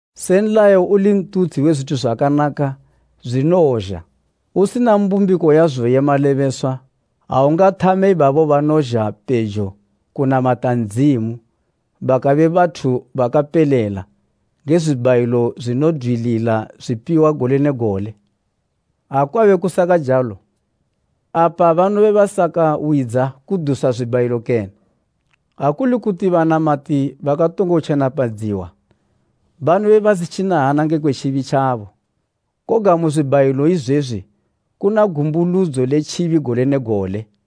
Se nlayo uli ntutshi we zwithu zwakanaka zwinowozha, usina mbumbiko yazo ye malebeswa, awungathame ibabo banozha pejo kunamata Ndzimu bakabe bathu bakapelela nge zwibhayilo zwinodwilila zwipiwa gole ne gole. Ha kwabe kusakajalo, apa banobe basakawidza kudusa zwibhayilo kene? Ha kuli kuti banamati bakatongo tjenapadziwa, banobe basitjina hana nge kwe tjibi tjabo. Koga mu zwibhayilo izwezwi kuna gumbuludzo le tjibi gole ne gole,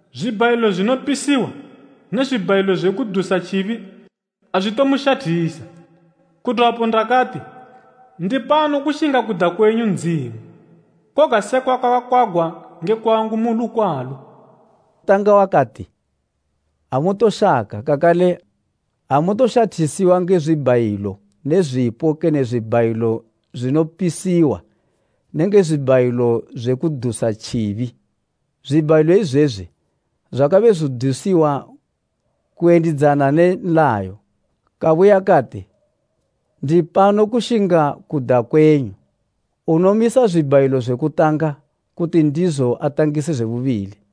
Zwibhayilo zwinopisiwa, ne zwibhayilo zwe kudusa tjibi azwitomushathisa. Kudwapo ndakati, ‘Ndipano kushinga kuda kwenyu Ndzimu, koga sekwa kwakakwagwa nge kwangu mu lukwalo.’” Kutanga wakati, “Amutoshaka, kakale amutoshathisiwa nge zwibhayilo ne zwipo kene zwibhayilo zwinopisiwa nenge zwibhayilo zwe kudusa tjibi.” (Zwibhayilo izwezwi, zwakabe zwidusiwa kuyendidzana ne nlayo). Kabuya kati, “Ndipano kushinga kuda kwenyu.” Unomisa zwibhayilo zwe kutanga kuti ndizo atangise zwe bubili.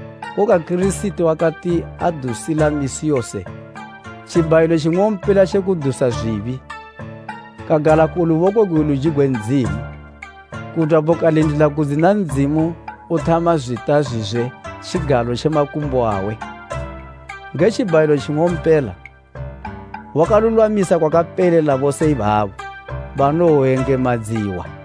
Koga Kirisiti wakati adusila misi yose tjibhayilo tjing'ompela tje kudusa zwibi, kagala ku luboko gwe luji gwe Ndzimu. Kudwapo kalindila kudzina Ndzimu uthama zwita zwizwe tjigalo tje makumbo awe. Nge tjibhayilo tjing'ompela, wakalulwamisa kwakapelela bose ibabo banoyengemadziwa.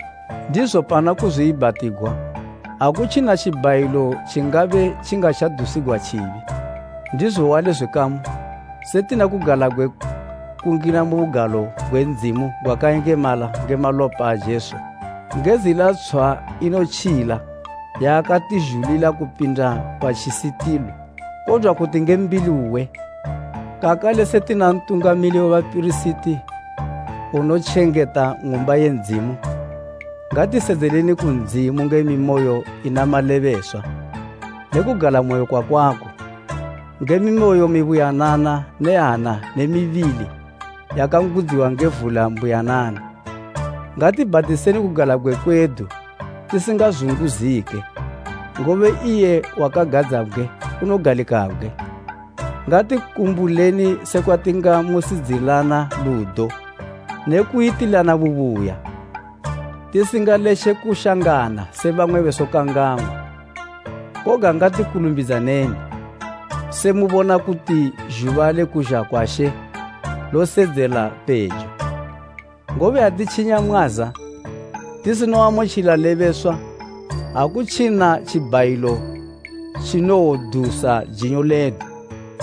Ndizo pana kuzwiibhatigwa, akutjina tjibhayilo tjingabe tjingatjadusigwa tjibi. Ndizo wali, zwikamu, se tina kugalabgwe kungina mu Bugalo gwakayengemala kupindisa nge malopa a Jesu, nge zila tshwa inotjila yaakatizhulila kupinda pa tjisitili, kodwa kuti nge mbili uwe, kakale se tina Ntungamili we bapirisiti unotjengeta Ng'umba ye Ndzimu, ngatisedzeleni ku Ndzimu nge mimoyo ina malebeswa ne kugalamoyo kwakwako, nge mimoyo mibuyanana ne hana ne mibili yakangudziwa nge vula mbuyanana. Ngatibhatiseni kugalabgwe kwedu tisingazunguzike, ngobe iye wakagadzabgwe unogalikabgwe. Ngatikumbuleni sekwa tingamusidzilana ludo ne kuyitilana bubuya, tisingaletje kushangana se bamwe besokang'angwa. Koga ngati kulumbidzaneni, se mubona kuti zhuba le kuzha kwa She losedzela pejo. Ngobe atitjinya mwaza tisinoamutjila lebeswa, akutjina tjibhayilo tjinowodusa jinyo ledu.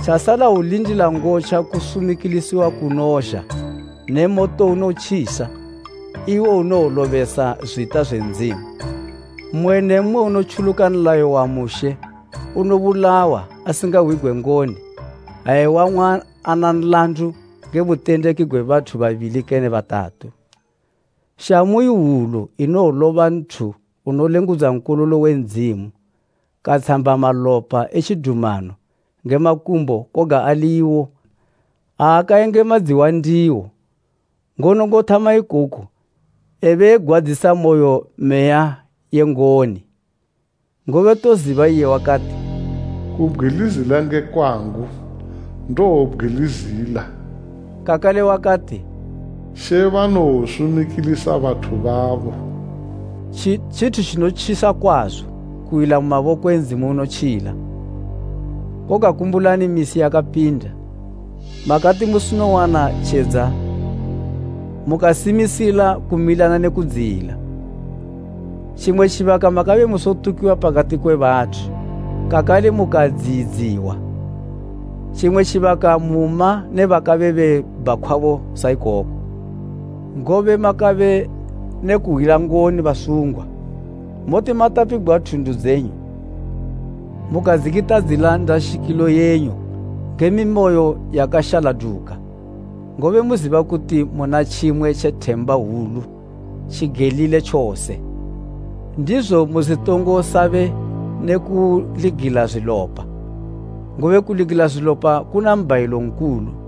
Tjasala hwulindila ngotja kusumikilisiwa kunozha ne moto unotjisa, iwo unowolobesa zwita zwe Ndzimu. Mmwe ne mmwe unotjuluka nlayo wa Mushe unobulawa asingahwigwe ngoni ha ewang'wa ana nlandu nge butendeki gwe bathu babili kene batatu. Shamu ihwulu inowoloba nthu unolengudza Nkololo we Ndzimu katshamba malopa e tjidumano nge makumbo koga ali iwo aakayengemadziwa ndiwo, ngono ngothama ikoku ebe egwadzisa moyo Meya ye ngoni. Ngobe toziba iye wakati, “Kubgwilizila nge kwangu, ndowobgwilizila.” Kakale wakati, “She banowosumikilisa bathu babo.” Tjithu tjinotjisa kwazo kuwila mu maboko e Ndzimu unotjila! Koga kumbulani misi yakapinda, makati musinowana tjedza mukasimisila kumilana ne kudziyila, Tjimwe tjibaka makabe musotukiwa pakati kwe bathu kakale mukadziyidziwa, tjimwe tjibaka muma ne bakabe bebhakhwabo saikoko. Ngobe makabe ne kuhwila ngoni basungwa, muti matapigwa thundu dzenyu, mukadzikitadzila ndashikilo yenyu nge mimoyo yakashaladuka, ngobe muziba kuti muna tjimwe tje themba hwulu tjigelile tjose. Ndizo musitongo sabe ne kuligila zwilopa, ngobe kuligila zwilopa kuna mbhayilo nkulu.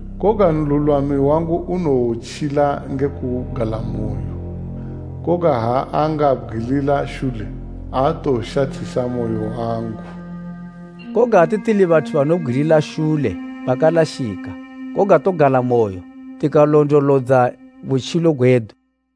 Koga nlulwami wangu unowotjila nge kugalamoyo, koga ha angabgwilila shule, aatowoshathisa moyo wangu.” Koga ate tili bathu banobgwilila shule bakalashika. Koga togalamoyo tikalondolodza butjilo gwedu.